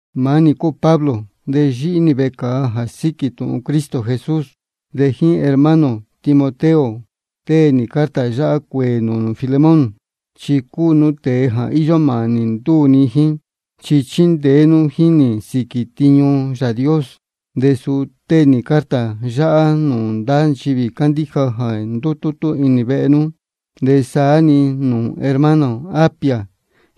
Maá nī cúu Pablo, de yíhí nī vecāa jā síquī tūhun Cristo Jesús. De jíín hermano ō Timoteo tée nī carta yáhá cuēē nūū nū Filemón. Chi cúu nú tēe jā íyó mānī ndúū ni jíín, chi chíndeé nú jíín nī sīquī tiñu Yāā Dios. De suni tée nī carta yáhá nūū ndá nchivī cándíja jā ndútútú inī vehe nú, de saá-ni nūū hermana ō Apia,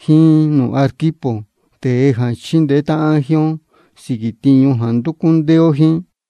jíín nūū Arquipo, tēe jā chíndeé táhán jíín ó sīquī tiñu jā ndúcú ndéé ó jíín.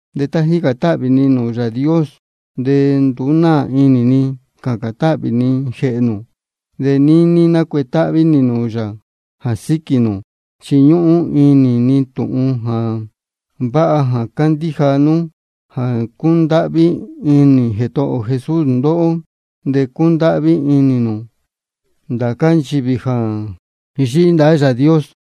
De tá jícān táhvī ni nūū Yāā Dios de nduú náā inī ni cācān táhvī ni jēhē nū, de níní nácuetáhví nī nūū yā jā síquī nū. Chi níhīn ni tūhun jā vāha cándíja nú jā cúndáhví inī Jētohō ō Jesús ndóhó, de cúndáhví inī nū ndācá nchivī jā yíhí ndahá Yāā Dios.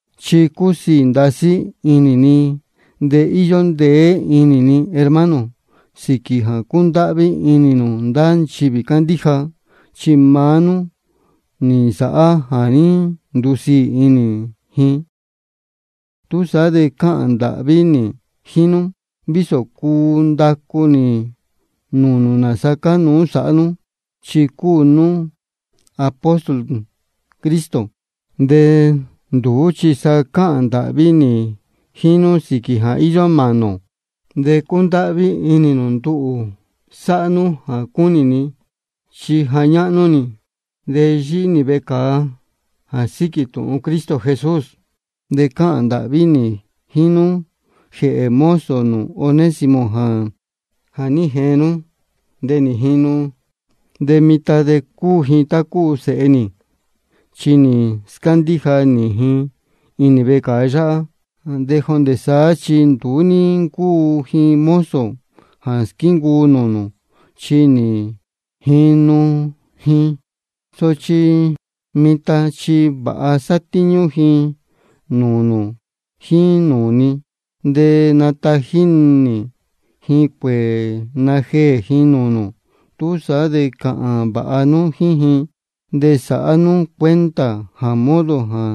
Chi cúsiī ndasí inī ni de íyó ndeé inī ni, hermano, sīquī jā cúndáhví inī nū ndá nchivī cándíja. Chi maá nú nī nsāhá jā ní ndusiī inī ji. Túsaá de cáhān ndāhví nī jíín nú, vísō cuu ndacu nī nūū nū nāsa cánuú sāhá nú, chi cúu nī apóstol Cristo. De nduú chi sa cáhān ndāhví nī jíín nú sīquī jā íyó mānī ō. De cundáhví inī nū nduhū sāhá nú jā cúnī ni, chi ja ñáhnú nī, de yíhí nī vecāa jā síquī tūhun Cristo Jesús. De cáhān ndāhví nī jíín nú jēhē mozo nū Onésimo jā ní jeen nú de nī jinu. De mitan de cúu ji tá cúu sēhe nī, chi nī scándíja nī ji inī vecāa yáhá. De jondē saá chi nduú ní ncúu ji mozo jā squíncuu nūū nū, chi nī jinu ji. Sochi mitan chi vāha satíñú ji nūū nū jíín nūū ni. De natají nī ji cuēē najeē ji nūū nū. Túsaá de cāhān vāha nú jíín ji, de sāhá nú cuenta jā modo jā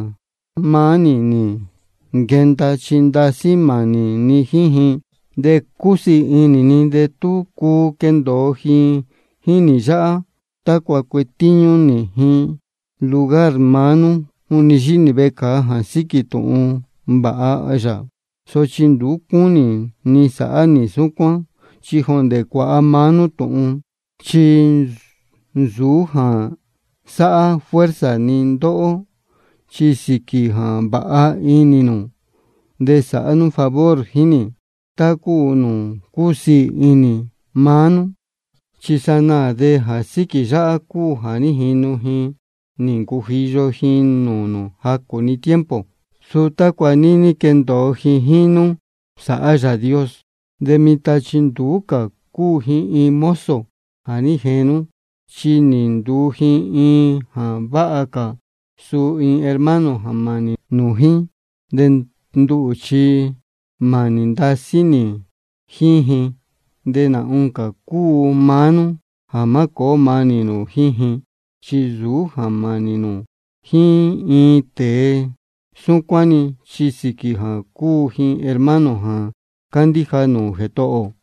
maá nī nī nquenda, chi ndasí mānī ni jíín ji. De cusiī inī ni de tú cuu quendōo ji jíín nī yáhá, tácua cuetíñú nī ji lugar maá nú juni yíhí nī vecāa jā síquī tūhun vāha yā. Sochi nduú cúnī ni sāhá nī súcuán, chi jondē cuāha maá nú tūhun. Chi nsūú jā sáhá fuerza ni ndóhó, chi sīquī jā vāha inī nū de sāhá nú favor jíín nī, tá cúu nūū cúsiī inī maá nú. Chi sanaā de jā síquī yáhá cúu jā ní jinu ji nī ncujiyo ji nūū nū jacū-ni tiempo, suu tácua níní quendōo ji jíín nú sāhá Yāā Dios. De mitan chi nduú cā cúu ji iin mozo jā ní jeen nú, chi nī nduu ji iin jā váha cā, suu iin hermano jā mānī nū jíín. De nduhū chi mānī ndasí nī jíín ji, de nā oncā cúu maá nú jā má cōó mānī nū jíín ji. Chi nsūú jā mānī nū jíín iin tēe súcuán-ni, chi sīquī jā cúu ji iin hermano jā cándíja nūū Jētohō ō.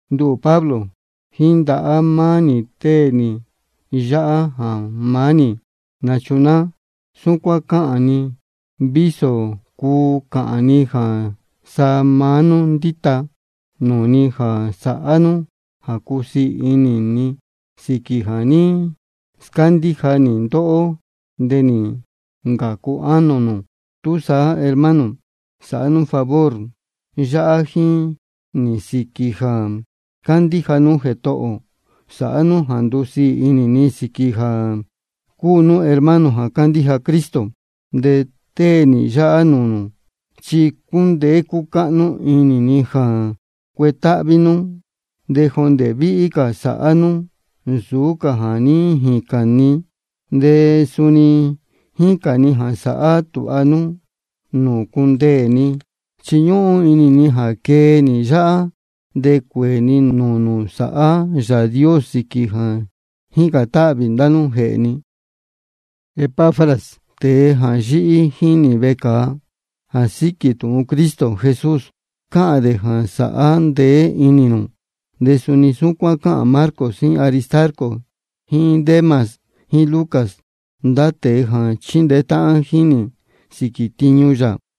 Nduhū Pablo, jíín ndahá maá nī tée nī yáhá jā maá nī nachunáá. Súcuán cáhān ni vísō cuu cāhān ni jā sa maá nú ndíta nūū ni jā sāhá nú jā cusiī inī ni sīquī jā ní scándíja nī ndóhó de nī ncācu ánō nū. Túsaá, hermano, sāhá nú favor yáhá jíín nī sīquī jā cándíja nú Jētohō ō. Sāhá nú jā ndusiī inī ni, sīquī jā cúu nú hermano jā cándíja Cristo. De tée nī yáhá nūū nū, chi cúndeé cúcáhnú inī ni jā cuetáhví nú, de jondē víhí cā sāhá nú nsūú cā jā ní jīcān ni. De suni jícān ni jā sāhá tūha nú nūū cundeē ni, chi ñúhún inī ni jā quee nī yáhá de cuēē ni nūū nū sāhá Yāā Dios sīquī jā jícān táhvī ndá nú jēhē ni. Epafras, tēe jā yíhí jíín nī vecāa jā síquī tūhun Cristo Jesús, cáhān dē jā sāhá ndeé inī nū. De suni súcuán cáhān Marcos jíín Aristarco jíín Demas jíín Lucas, ndá tēe jā chíndeé táhán jíín nī sīquī tiñu yā.